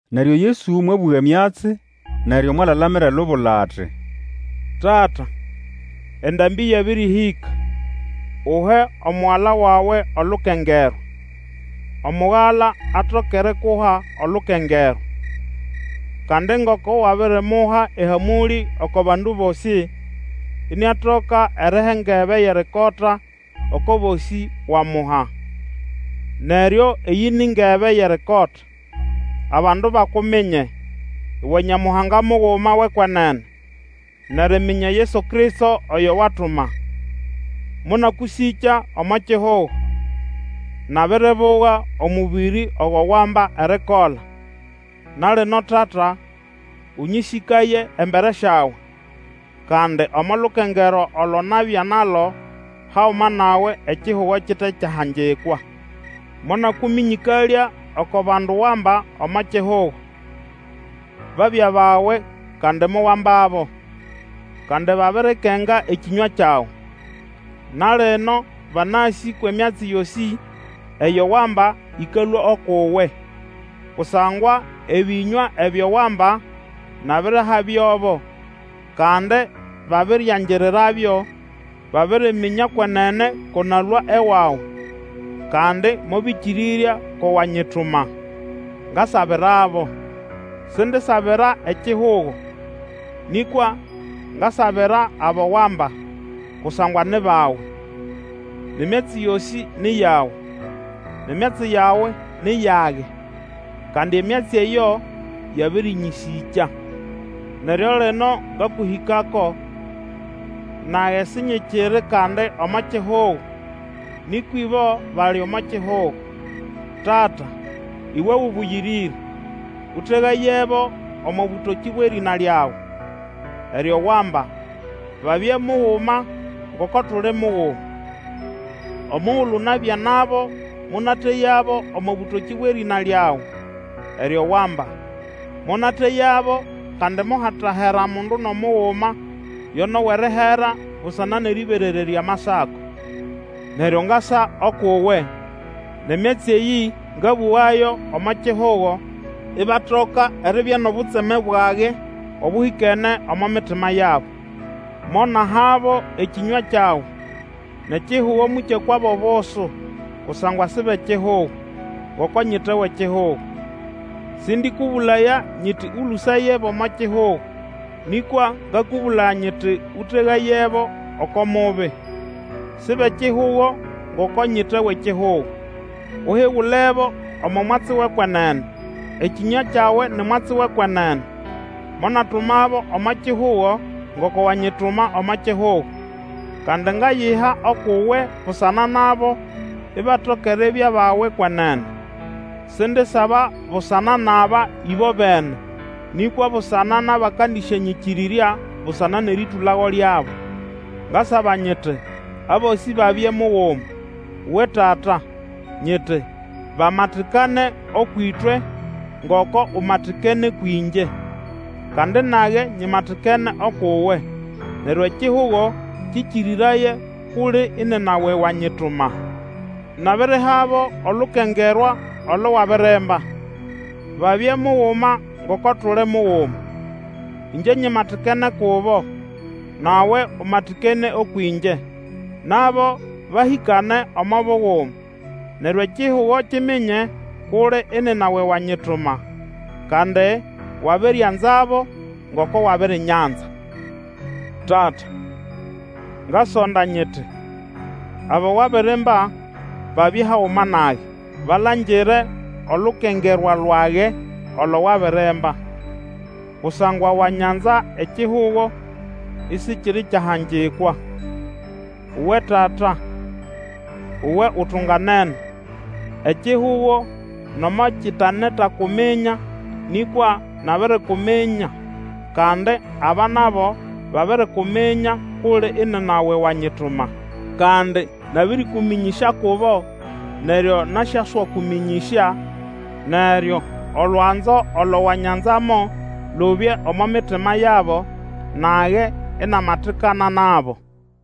Neryo Yesu mwabũga emyatsi, neryo mwalalamira elubula ati, Tata endambĩ yabĩrĩhĩka; uhe Omugala wawe olukengerwa, Omugala atoke erikuha olukengerwa. Kandi ngoko wabirimuha ehamũlĩ oko bandu bosĩ, iniatoka eriha engebe yʼerikota oko bosĩ wamuha. Neryo eyĩ ni ngebe yʼerikota, abandu bakuminye, uwe Nyamuhanga muguma wʼekwenene, nʼeriminya Yesu Kristo, oyo watuma. Monakũsĩkya omo kihugo; nabiribuga omũbĩrĩ ogo wamba erikola. Na lino, Tata, ũnyĩsĩkaye embere syawe, kandi omo lukengerwa olo nabya nalo haguma nawe ekihugo kite kyahangikwa, Monakũmĩnyĩkalya oko bandu wamba omo kihugo. Babya bawe kandi mowambabo. Kandi babirikenga ekĩnywa kyawe. Na lino, banasĩ kwʼemyatsi yosĩ eyo wamba ĩkalũa ukʼuwe. Kusangwa ebĩnywa ebyo wamba nabirihabyobo, kandi babiriangirirabyo, baririminya kwenene ko nalũa ewawe, kandi mobĩkĩrĩrya ko wanyituma. Ngasabirabo. Sindisabira ekihugo, nĩkwa ngasabira abo wamba, kusangwa ni bawe. Nʼemyatsi yosĩ ni yawe, nʼemyatsi yawe ni yage, kandi emyatsi eyo yabĩrĩnyĩsĩkya. Neryo lino ngakũhĩkako, nage sinyikiri kandi omo kihugo, nĩkwa ibo bali omo kihugo. Tata Iwe Ũbũyĩrĩre! Ũtegayebo omo bũtokĩ bwʼerĩna lyawe, eryo wamba, babye muguma, ngoko tuli muguma. Omugulu nabya nabo, monateyabo omo bũtokĩ bwʼerĩna lyawe, eryo wamba. Monateyabo, kandi mohatahera mundu nʼomuguma, yo nʼowʼerihera, busana nʼerĩberererya Amasako. Neryo ngasa ukʼuwe, nʼemyatsi eyĩ ngabũgayo omo kihugo, ibatoka eribya nʼobutseme bwage obũhĩkene omo mitima yabo. Monahabo ekĩnywa kyawe, nʼekihugo mokyakwabo obusu, kusangwa si bʼekihugo, ngoko nyite wʼekihugo. Sĩndĩkũbũlaya nyiti, Ũlũsayebo omo kihugo, nĩkwa ngakũbũlaya nyiti, Ũtegayebo oko Mubi. Si bʼekihugo, ngoko nyite wʼekihugo. Uhigulebo omo mwatsi wʼekwenene. Ekĩnywa kyawe ni mwatsi wʼekwenene. Monatumabo omo kihugo, ngoko wanyituma omo kihugo. Kandi ngayiha ukʼuwe busana nabo, ibatoka eribya bawe kwenene. Sindisaba busana nʼaba ĩbobene, nĩkwa busana nʼabakandisyanyĩkĩrĩrya busana nʼerĩtũlago lyabo. Ngasaba nyiti abosĩ babye muguma. Uwe Tata! Nyiti, bamatikane ũkwʼĩtwe, ngoko umatikene kwĩngye, kandi nage nyimatikene ukʼuwe, neryo ekihugo kĩkĩrĩraye kʼuli inina we wanyituma. Nabirihabo olukengerwa olo wabirimba, babye muguma ngoko tuli muguma. Ĩngye nyimatikene kubo, nawe umatikene ũkwʼĩngye, nabo bahĩkane omo buguma, neryo ekihugo kiminye kʼuli inina we wanyituma, kandi wabirianzabo, ngoko wabirinyanza. Tata, ngasonda nyiti, abo wabirimba babye haguma nage, balangire olukengerwa lwage olo wabirimba; kusangwa wanyanza ekihugo isikiri kyahangikwa. Uwe Tata uwe utunganene! Ekihugo nomo kitenetakuminya, nĩkwa nabirikuminya, kandi aba nabo babirikuminya kʼuli inina we wanyituma. Kandi nabĩrĩkũmĩnyĩsya kubo neryo nasyaswakũmĩnyĩsya; neryo olwanzo olo wanyanzamo lubye omo mitima yabo, nage inamatikana nabo.